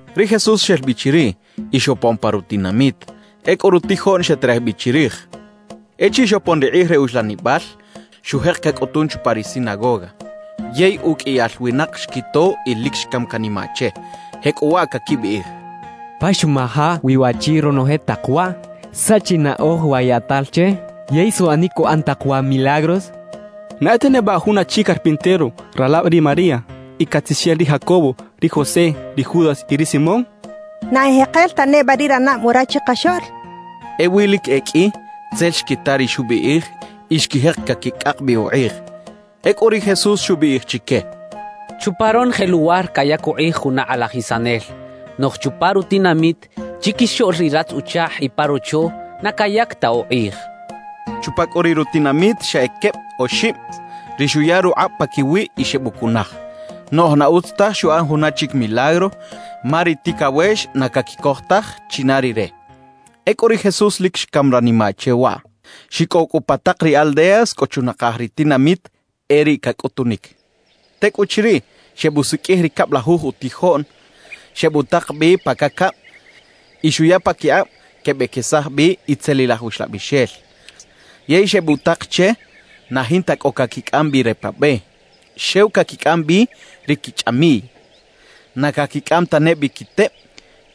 Ri Jesús xel bi chiriꞌ y xopon pa rutinamit. Ecꞌu rutijoꞌn xeterej bi chirij. Echiriꞌ xopon ri kꞌij re uxlanibal, xujek cacꞌutun chupa ri sinagoga. Yey uqꞌuiyal winak xquito y lic xcam canimaꞌ che, jecꞌuwaꞌ caquibiꞌij: —¿Pa xuꞌmaja wi waꞌchi ronoje tak waꞌ? ¿Saꞌ chi naꞌoj wa yaꞌtal che, yey suꞌanic cuꞌan tak wa milagros? ¿Na e ta neba jun achi carpintero; ralab ri María y catzixel ri Jacobo, ri José, ri Judas y ri Simón? ¿Na ejekel ta neba ri ranab wara chikaxoꞌl? —quechaꞌ. Ewi lic e qꞌui tzel xquita ri xubiꞌij y xquijek caquicꞌak bi ukꞌij. Ecꞌu ri Jesús xubiꞌij chique: —Chupa ronoje luwar cayac ukꞌij juna kꞌalajisanel. Noꞌj chupa rutinamit, chiquixoꞌl ri ratz-uchakꞌ y pa rocho, na cayac ta ukꞌij —xcha chique. Chupa cꞌu riꞌ rutinamit xa e queb oxib ri xuya rukꞌab paquiwiꞌ y xebucunaj, noꞌj na utz taj xuꞌan juna chic milagro ma ri ticawex na caquicoj taj china Rire. Ecꞌu ri Jesús lic xcam ranimaꞌ che waꞌ. Xicꞌow cꞌu pa tak ri aldeas cꞌo chunakaj ri tinamit e riꞌ cacꞌutunic. Tecꞌuchiriꞌ, xebusiqꞌuij ri cablajuj utijoꞌn, xebutak bi pa cacab y xuya paquikꞌab quebequesaj bi itzelilaj uxlabixel. Yey xebutak che na jinta cꞌo caquicꞌam bi re pa be; xew caquicꞌam bi ri quichꞌamiꞌy. Na caquicꞌam tane bi quiteb,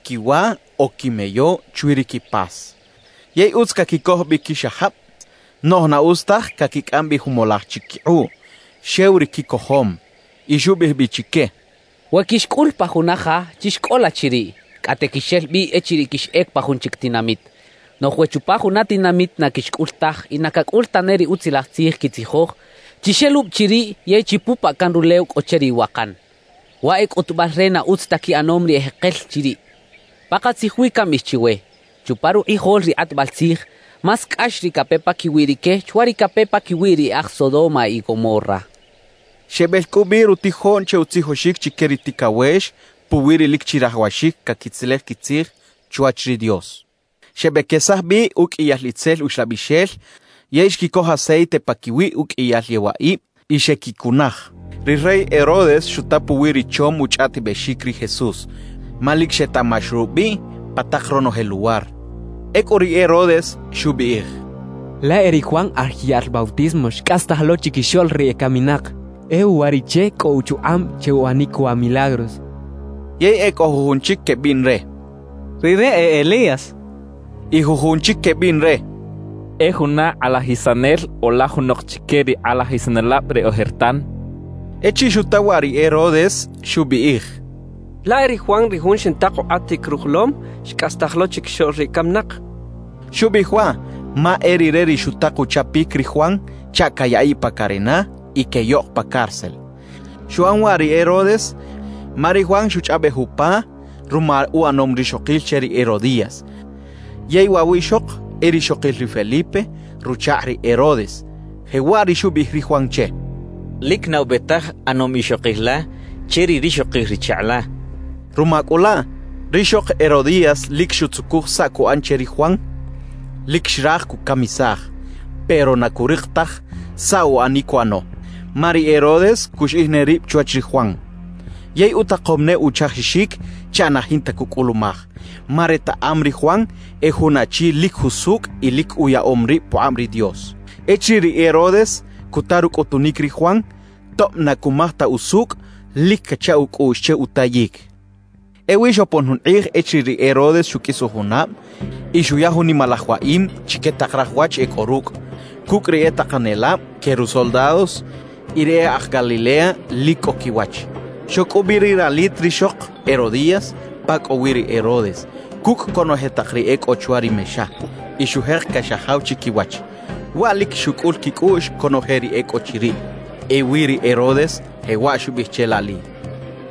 quiwa o quimeyo chwi ri quipas. Yey utz caquicoj bi quixajab; noꞌj na utz taj caquicꞌam bi jumolaj chic quikꞌuꞌ, xew ri quicojom. Y xubiꞌij bi chique: «We quixcꞌul pa juna ja, chixcꞌola chiriꞌ; cꞌate quixel bi echiriꞌ quixꞌec pa jun chic tinamit. Noꞌj we chupa juna tinamit na quixcꞌul taj y na cacꞌul tane ri Utzilaj Tzij quitzijoj, chixelubi chiriꞌ yey chipupaꞌ can rulew cꞌo che ri iwakan; waꞌ e cꞌutubal re na utz ta quiꞌanom ri ejekel chiriꞌ. Pakatzij wi cambiꞌij chiwe: Chupa rukꞌijol ri kꞌatbal tzij, más cꞌax ri cape paquiwi rique chwa ri cape paquiwi ri e aj Sodoma y Gomorra» xchaꞌ. Xebel cꞌu bi rutijoꞌn che utzijoxic chique ri ticawex puwi ri lic chirajawaxic caquitzelej quitzij chwach ri Dios. Xebequesaj bi uqꞌuiyal itzel uxlabixel yey xquicoj aceite paquiwi uqꞌuiyal yewaꞌib y xequicunaj. Ri rey Herodes xuta puwi ri chom uchꞌaꞌtibexic ri Jesús, ma lic xetaꞌmax rubiꞌ pa tak ronoje luwar. Ecꞌu ri Herodes xubiꞌij: «Laꞌ e ri Juan Aj Yaꞌl Bautismo xcꞌastaj lo chiquixoꞌl ri ecaminak; e uwariꞌche cꞌo uchukꞌab che uꞌanic wa milagros» xchaꞌ. Yey e cꞌo jujun chic quebiꞌn re: «Rire e Elías» y jujun chic quebiꞌn re: «E juna kꞌalajisanel o laj junok chique ri kꞌalajisanelab re ojertan.» Echiriꞌ xuta waꞌ ri Herodes, xubiꞌij: «Laꞌ e ri Juan ri jun xintak ukꞌatic rujolom, xcꞌastaj lo chiquixoꞌl ri ecaminak» xchaꞌ. Xubiꞌij waꞌ ma e rire ri xutak uchapic ri Juan chaꞌ cayaꞌiꞌ pa carena y queꞌyoꞌk pa cárcel. Xuꞌan waꞌ ri Herodes ma ri Juan xuchꞌaꞌbej upa ruma uꞌanom rixokil che ri Herodías, yey waꞌ wiꞌxok e rixokil ri Felipe ruchakꞌ ri Herodes. Jewaꞌ ri xubiꞌij ri Juan che: «Lic na ube taj ꞌanom ixokil la che ri rixokil ri chakꞌ la» xchaꞌ. Ruma cꞌu laꞌ, rixok Herodías lic xutzucuj saꞌ cuꞌan che ri Juan. Lic xraj cucamisaj; pero na curik taj saꞌ uꞌanic cuꞌano, ma ri Herodes cuxiꞌij ne rib chwach ri Juan. Yey utakom ne uchajixic chaꞌ na jinta cucꞌulumaj, ma retaꞌam ri Juan e jun achi lic jusucꞌ y lic uyaꞌom rib pukꞌab ri Dios. Echiriꞌ ri Herodes cuta rucꞌutunic ri Juan, tob na cumaj ta usucꞌ, lic cacha ucꞌuꞌx che utayic. Ewi xopon jun kꞌij echiriꞌ ri Herodes xuqꞌuis ujunab y xuya jun nimalaj waꞌim chique tak raj wach e cꞌo rucꞌ, cucꞌ ri e takanelab que rusoldados y ri e aj Galilea lic cꞌo quiwach. Xoc cꞌu bi ri ralit rixok Herodías pa cꞌo wi ri Herodes cucꞌ conoje tak ri e cꞌo chwa ri mexa, y xujek caxajaw chiquiwach. Waꞌ lic xucꞌul quicꞌuꞌx conoje ri e cꞌo chiriꞌ. Ewi ri Herodes jewaꞌ xubiꞌij che laꞌli: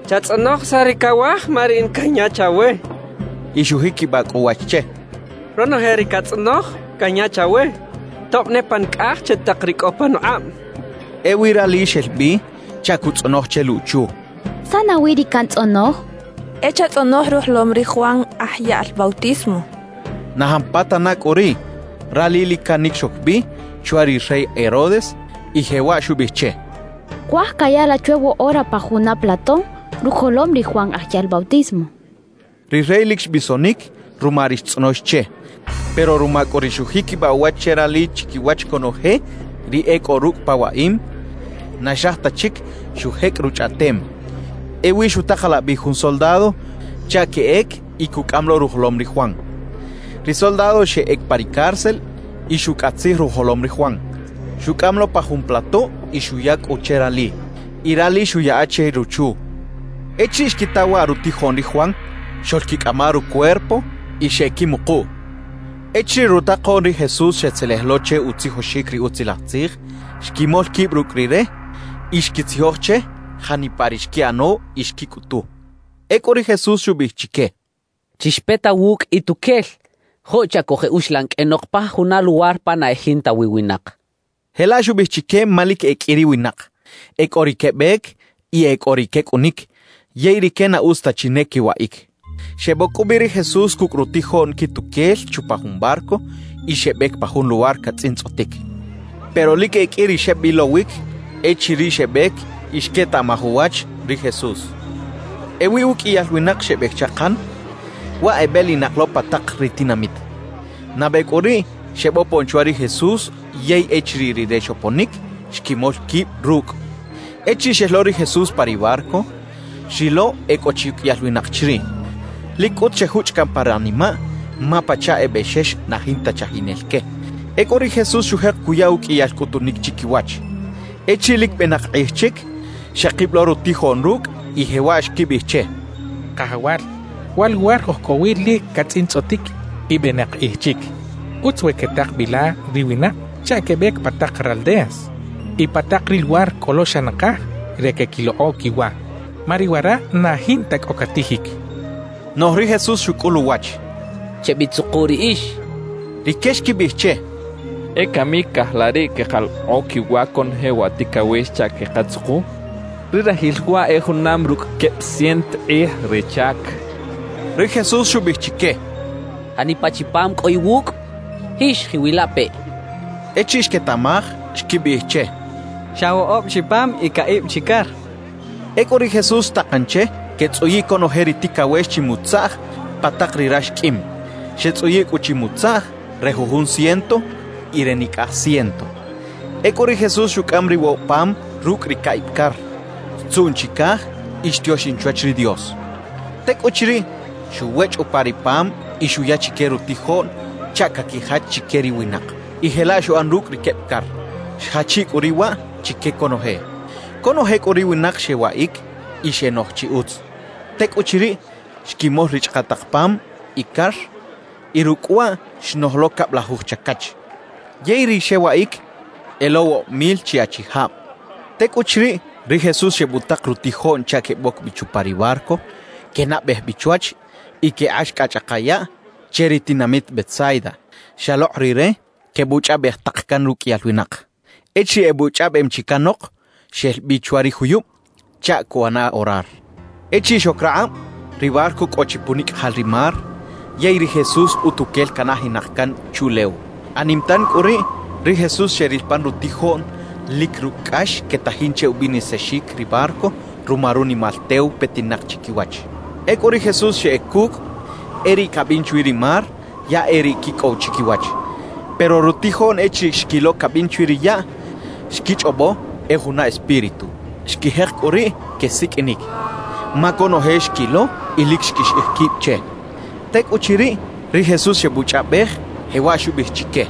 «Chatzꞌonoj saꞌ ri cawaj, ma riꞌin canya chawe» xchaꞌ. Y xujiquibaꞌ cꞌu uwach che: «Ronoje ri catzꞌonoj, canya chawe, tob ne pa nicꞌaj che tak ri cꞌo panukꞌab» xchaꞌ. Ewi rali xel bi chaꞌ cuꞌtzꞌonoj che luꞌchu: «¿Saꞌ nawi ri cantzꞌonoj?» xchaꞌ. «E chatzꞌonoj rujolom ri Juan Aj Yaꞌl Bautismo» xcha ruchu che. Na jampatana cꞌu riꞌ, rali lic canic xoc bi chwa ri rey Herodes y jewaꞌ xubiꞌij che: «Cuaj caya la chwe woꞌora pa juna plato rujolom ri Juan Aj Yaꞌl Bautismo» xcha che. Ri rey lic xbisonic ruma ri xtzꞌonox che. Pero ruma cꞌu ri xujiquibaꞌ uwach che rali chiquiwach conoje ri e cꞌo rucꞌ pa waꞌim, na xraj ta chic xujecꞌ ruchꞌaꞌtem. Ewi xutakalaꞌ bi jun soldado chaꞌ queꞌec y cucꞌam lo rujolom ri Juan. Ri soldado xeꞌec pa ri cárcel y xucꞌatzij rujolom ri Juan. Xucꞌam lo pa jun plato y xuya cꞌu che rali, y rali xuꞌyaꞌa che ruchu. Echiriꞌ xquita waꞌ rutijoꞌn ri Juan, xoꞌlquicꞌama rucuerpo y xeꞌquimukuꞌ. Echiriꞌ rutakoꞌn ri Jesús xetzelej lo che utzijoxic ri Utzilaj Tzij, xquimol quib rucꞌ Rire y xquitzijoj che janipa ri xquiꞌano y xquicꞌutu. Ecꞌu ri Jesús xubiꞌij chique: —Chixpeta wucꞌ ituquel, joꞌ chaꞌ cojeꞌuxlan qꞌuenok pa juna luwar pa na e jinta wi winak —xchaꞌ. Jelaꞌ xubiꞌij chique ma lic e qꞌui ri winak, e cꞌo ri quebec y e cꞌo ri quecꞌunic yey rique na utz ta chi ne quewaꞌic. Xeboc cꞌu bi ri Jesús cucꞌ rutijoꞌn quituquel chupa jun barco y xebec pa jun luwar catzꞌintzꞌotic. Pero lic e qꞌui ri xebilowic echiriꞌ xebec y xquetaꞌmaj uwach ri Jesús. Ewi uqꞌuiyal winak xebec chakan, waꞌ ebelinak lo pa tak ri tinamit. Nabe cꞌu riꞌ xebopon chwa ri Jesús yey echiriꞌ Rire xoponic, xquimol quib rucꞌ. Echiriꞌ xel lo ri Jesús pa ri barco, xrilo e cꞌo chi uqꞌuiyal winak chiriꞌ. Lic cꞌut xejuchꞌ caꞌn pa ranimaꞌ, ma pachaꞌ e bexex na jinta chajinel que. Ecꞌu ri Jesús xujek cuya uqꞌuiyal cꞌutunic chiquiwach. Echiriꞌ lic benak kꞌij chic, xekib lo rutijoꞌn rucꞌ y jewaꞌ xquibiꞌij che: —Kajawal, wa luwar oj cꞌo wi lic catzꞌintzꞌotic y benak kꞌij chic. Utz we quetak bi la ri winak chaꞌ quebec pa tak raldeas y pa tak ri luwar cꞌo lo xa nakaj re queꞌquilokꞌo quiwa, ma ri wara na jinta cꞌo catijic —xechaꞌ. Noꞌj ri Jesús xucꞌul uwach: —Chebitzuku riꞌix —xcha chique. Rique xquibiꞌij che: —¿E cami caꞌaj la riꞌ queꞌkalokꞌo quiwa conoje wa ticawex chaꞌ quekatzuku? ¡Ri rajil waꞌ e junam rucꞌ queb ciento kꞌij re chac! —xechaꞌ. Ri Jesús xubiꞌij chique: —¿Janipa chi pam cꞌo iwucꞌ? Jix jiꞌwilapeꞌ —xcha chique. Echiriꞌ xquetaꞌmaj, xquibiꞌij che: —Xa woꞌob chi pam y caꞌib chi car —xechaꞌ. Ecꞌu ri Jesús xtakan che quetzꞌuyiꞌ conoje ri ticawex chimutzaꞌj pa tak ri rax qꞌuim. Xetzꞌuyiꞌ cꞌu chimutzaꞌj re jujun ciento y re nicꞌaj ciento. Ecꞌu ri Jesús xucꞌam ri woꞌob pam rucꞌ ri caꞌib car, xtzuꞌn chicaj y xtioxin chwach ri Dios. Tecꞌuchiriꞌ, xuwechꞌ upa ri pam y xuya chique rutijoꞌn chaꞌ caquijach chique ri winak. Y jelaꞌ xuꞌan rucꞌ ri queb car, xjachiꞌ cꞌu riꞌ waꞌ chique conoje. Conoje cꞌu ri winak xewaꞌic y xenoj chi utz. Tecꞌuchiriꞌ, xquimol ri chꞌakaꞌtaꞌk pam y car, y rucꞌ waꞌ xnoj lo cablajuj chacach. Yey ri xewaꞌic e lo woꞌob mil chi achijab. Tecꞌuchiriꞌ, ri Jesús xebutak rutijoꞌn chaꞌ queboc bi chupa ri barco, quenabej bi chwach y quekꞌax cꞌa chꞌaka yaꞌ che ri tinamit Betsaida, xalokꞌ Rire quebuchꞌaꞌbej tak can ruqꞌuiyal winak. Echiriꞌ ebuchꞌaꞌbem chi canok, xel bi chwa ri juyub chaꞌ cuꞌana orar. Echiriꞌ xoc rakꞌab, ri barco cꞌo chi punicꞌajal ri mar, yey ri Jesús utuquel canajinak can chuꞌlew. Anim tan cꞌu riꞌ, ri Jesús xeril pan rutijoꞌn lic rucꞌ cꞌax quetajin che ubinisaxic ri barco ruma runimal tew petinak chiquiwach. Ecꞌu ri Jesús xeꞌec cucꞌ; e riꞌ cabin chwi ri mar, ya e riꞌ quicꞌow chiquiwach. Pero rutijoꞌn echiriꞌ xquilo cabin chwi ri yaꞌ, xquichꞌobo e juna espíritu. Xquijek cꞌu riꞌ quesiqꞌuinic, ma conoje xquilo y lic xquixiꞌij quib che. Tecꞌuchiriꞌ, ri Jesús xebuchꞌaꞌbej, jewaꞌ xubiꞌij chique: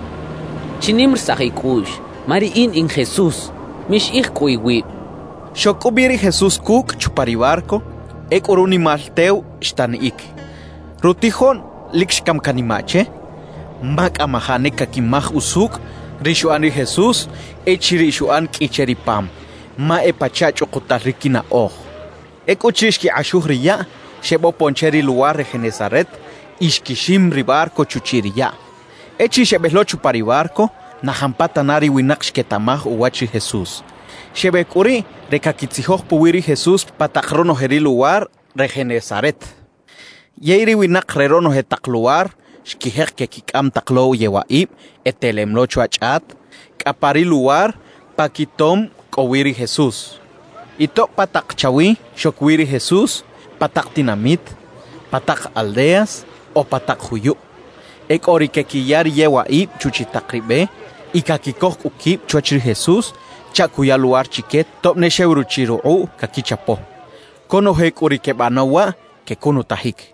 —Chinimarisaj icꞌuꞌx, ma riꞌin in Jesús; mixiꞌij cꞌu iwib —xcha chique. Xoc cꞌu bi ri Jesús cucꞌ chupa ri barco; ecꞌu runimal tew xtaniꞌic. Rutijoꞌn lic xcam canimaꞌ che, ma cꞌamajaꞌ ne caquimaj usucꞌ ri xuꞌan ri Jesús echiriꞌ xuꞌan qꞌui che ri pam, ma e pachaꞌ chꞌukutal ri quinaꞌoj. Ecꞌuchiriꞌ xquikꞌaxuj ri yaꞌ, xebopon che ri luwar re Genesaret y xquixim ri barco chuchiꞌ ri yaꞌ. Echiriꞌ xebel lo chupa ri barco, na jampatana ri winak xquetaꞌmaj uwach ri Jesús. Xebec cꞌu riꞌ re caquitzijoj puwi ri Jesús pa tak ronoje ri luwar re Genesaret. Yey ri winak re ronoje tak luwar xquijek quequicꞌam tak lo yewaꞌib e telem lo chwa chꞌat cꞌa pa ri luwar pa quitom cꞌo wi ri Jesús. Y tob pa tak chawi xoc wi ri Jesús, pa tak tinamit, pa tak aldeas o pa tak juyub, e cꞌo ri quequiya ri yewaꞌib chuchiꞌ tak ri be y caquicoj cꞌu quib chwach ri Jesús chaꞌ cuya luwar chique tob ne xew ruchiꞌ rukꞌuꞌ caquichapo. Conoje cꞌu ri quebanaw waꞌ, quecunutajic.